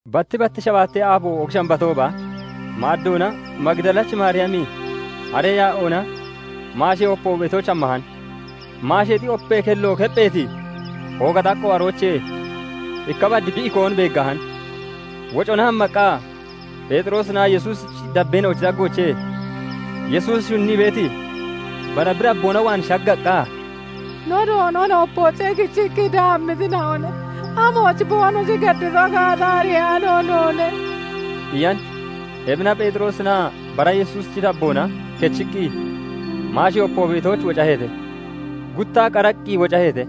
Batti batti shabaatee aabo, Oogi Shambatooba maaddoona Magidalachi Maariyami haree yaa'oona maashee opo beetooch hammahan; maasheexi opee kello keppheeti ooga xaqqo aroochee ikka bad bi ikoon beeggahan. Wocona hammaqqa Pheexiroosinaa Yesuusichi dabbeena'ochi daggoochee Yesuus shunnii beeti bara bi dabboona waan shaggaqqa, "No Doonon opoochee kichii daammitina'one; amooch boonoshi geddito gaata ariyaano noone" iyan. Ebina Pheexiroosinaa bara Yesuusichi dabboona kechiqqi maashee opo beetooch wocaheete. Guttaa qaraqqi wocaheete;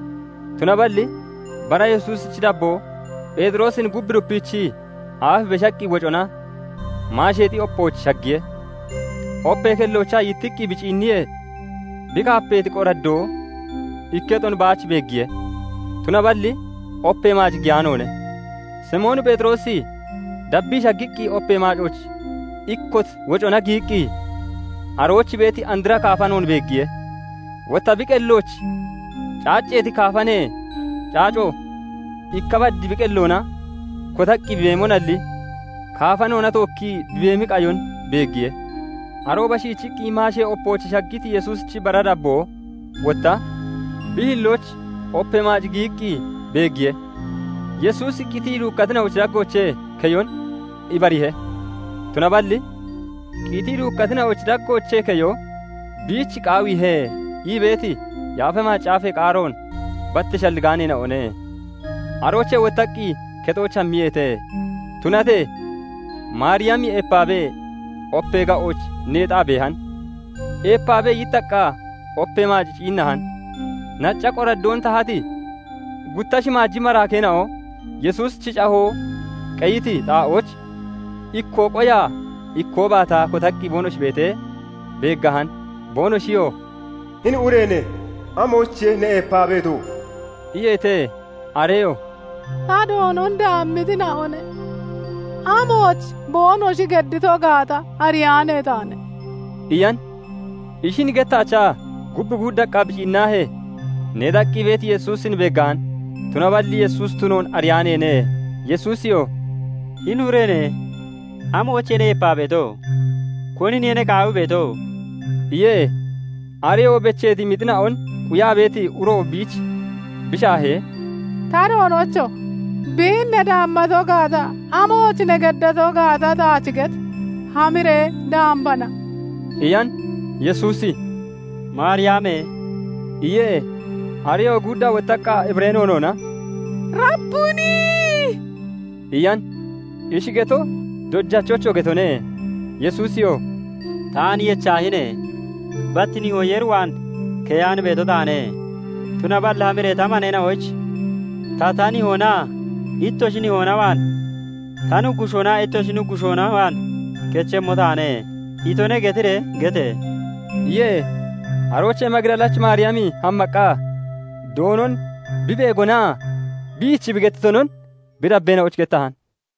tunaballi bara Yesuusichi dabboo Pheexiroosin gub dupiichii aaf beshaqqi wocona maasheexi opooch shaggiye; opee kelloochaa yittiqqi bi ciinniyee, bi kaapeeti qoraddoo ikketon baach beeggiye; tunaballi opee maac giyaanoone. Simoon Pheexiroosi dabbii shaggiqqi opee maac ikkot wocona giyiqqi arooch beeti andra kaafanoon beeggiye; Wotta bi qellooch caacceeti kaafanee caaco ikka bad bi qelloona kotaqqi beemonalli kaafanoona tookkii bi beemi qayon beeggiye. Arooba shiichiqqi maashee opooch shaggiti Yesuusichi bara dabboo wotta bi hillooch opee maac giyiqqi beeggiye; Yesuusi qitii duukkatina'ochi daggoochee keyon ibariihe. Tunaballi "Qitii duukkatina'ochi daggoochee keyo biich qaawiihe" ii beeti Yaafa Macaafee qaaroon bat shalligaaneena'one. Aroochee wottaqqi kexooch hammiyeete. Tunatee Maariyami eepaabee opee ga'ooch neexaa beehan. Eepaabee yittaqqa opee maac ciinnahan. Nacca qoraddoon tahati gutta shimaaji maraakeena'o Yesuusichi cahoo qeyiti xaa'ooch, ikkoo qoyaa, ikkoo baataa kotaqqi boonoshi beetee, beeggahan. Boonoshiyoo "Hini ureene! Amoyichiye ne eepaa beeto?" iyeete. Areyoo "Ta Doonon daammitina'one; amooch boonoshi geddito gaata ariyaane taane" iyan. Ishin gettaachaa gub guuddaqqa bi ciinnahee, neexaqqi beeti Yesuusin beeggahan; tunaballi Yesuusi tunoon ariyaaneene. Yesuusiyoo "Hini ureene! Amoyichiye ne eepaa beeto? Koniniye ne qaawii beeto?" iye. Areyoo becheeti mixina'on quyaa beeti uro biich bi shaahee, "Ta doonocho! Biin ne daammato gaata, amooch ne geddato gaata taach get! Hamiree dambana" iyan. Yesuusi "Maariyame!" iye. Areyoo guuddaa wottaqqa Hibiree noonoona "Rabbuni!" iyan; ishi geto "Dojachocho!" getone. Yesuusiyoo "Taan yechaahine! Bat Nihoo Yeer waan keyaan beeto taane. Tunaballi hamiree ta maneena'oyich ' "Ta, ta Nihoonaa ittoshi Nihoona waan, ta Nuggushoonaa ittoshi Nuggushoona waan kechemmo taane" itone' getiree gete!" iye. Aroochee Magidalachi Maariyami hammaqqa Doonon bi beegonaa biich bi gettitonon bi dabbeena'oyich gettahan.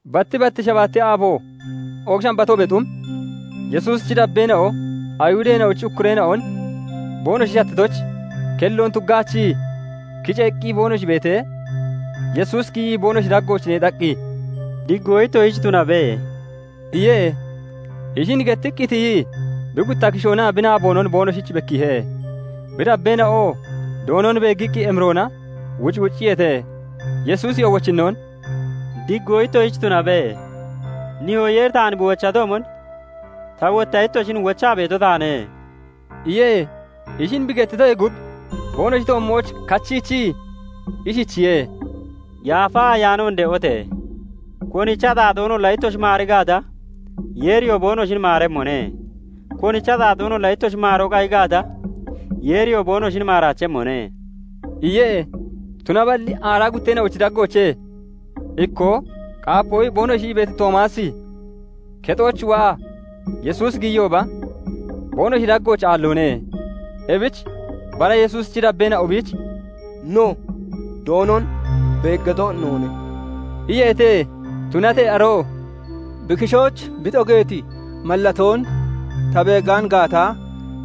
Batti batti shabaatee aabo, Oogi Shambatoobee xum, Yesuusichi dabbeena'o Ayihudeena'ochi ukkureena'on boonoshi shattitoyich, kelloon tuggaachii kiceeqqi boonoshi beetee, Yesuusi giyii boonoshi daggooch neexaqqi, "Diggoo ittoshich tunabe" iye. Ishin gettiqqi tiyii bi gutta kishoonaa bi naaboonon boonoshich bekkiihe. Bi dabbeena'oo Doonon beeggiqqi emiroona wucwucciyeete. Yesuusi wochinnoon "Diggoo ittoshich tunabe. Nihoo Yeeri taan bi wochatoomon ta wotta ittoshin wochaa beeto taane" iye. Ishin bi gettitoyee gub boonoshi toommooch kachiichii, ishichiye:- "Yaafa Ayaanoon de'ote! Konichi axaaxoonolla ittoshi maari Gaata, Yeeriyoo boonoshin maaremmone; konichi axaaxoonolla ittoshi maaroo qayi gaata, Yeeriyoo boonoshin maaraachemmone" iye. Tunaballi aaraa gutteena'ochi daggoochee ikkoo "Qaapoo" boonoshi ii beeti Toomaasi, kexooch waa Yesuusi giyiyooba, boonoshi daggooch aalloone. Ebich bara Yesuusichi dabbeena'o biich "No, Doonon beeggato noone" iyeete. Tunatee aroo "Bi kishooch bi xogeeti mallatoon ta beegaan gaata,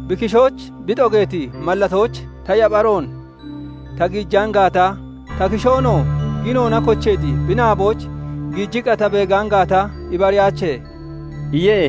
bi kishooch bi xogeeti mallatooch ta yapharoon (yabaroon) ta giijaan gaata, ta kishoonoo ginoona kocheeti bi naabooch giijiqqa ta beegaan gaata, ibariyaache" iye.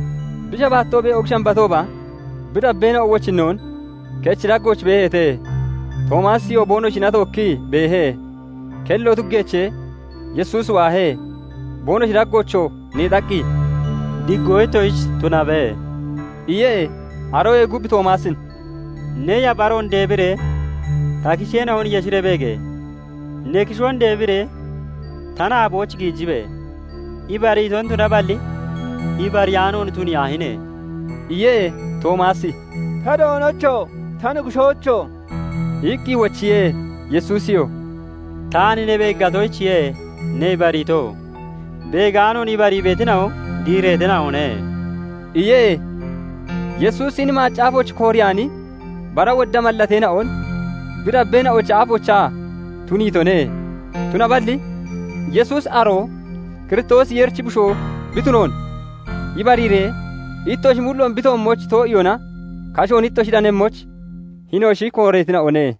Bi shabaattoobee Oogi Shambatooba bi dabbeena'o wochinnoon kechi daggooch beeheete; Toomaasiyoo boonoshina tookkii beehe. Kello tuggeechee Yesuusi waahe; boonoshi daggoochoo neexaqqi, "Diggoo ittoshich tunabe" iye. Aroyee gub Toomaasin "Ne yapharoon deebiree ta kisheena'on yeshiree beege! Ne kishoon deebiree ta naabooch giijibe! Ibariiton tunaballi ibariyaanoon tuniyaahine!" iye. Toomaasi "Ta Doonocho! Ta Nuggushoocho!" iqqi wochiye. Yesuusiyoo "Taan ne beeggatoyichiye ne ibariito; beegaanoon ibarii beetina'o diireetina'one" iye. Yesuusi hini macaafooch kooreyaani bara wodda mallateena'on bi dabbeena'ochi aafoochaa tuniitone; Tunaballi Yesuusi aroo Kiristoosi Yeerichi Bushoo bi tunoon ibariiree ittoshi mulloon bi toommooch too'iyoona kashoon ittoshi danemmoyich, hinoshi kooreetina'one.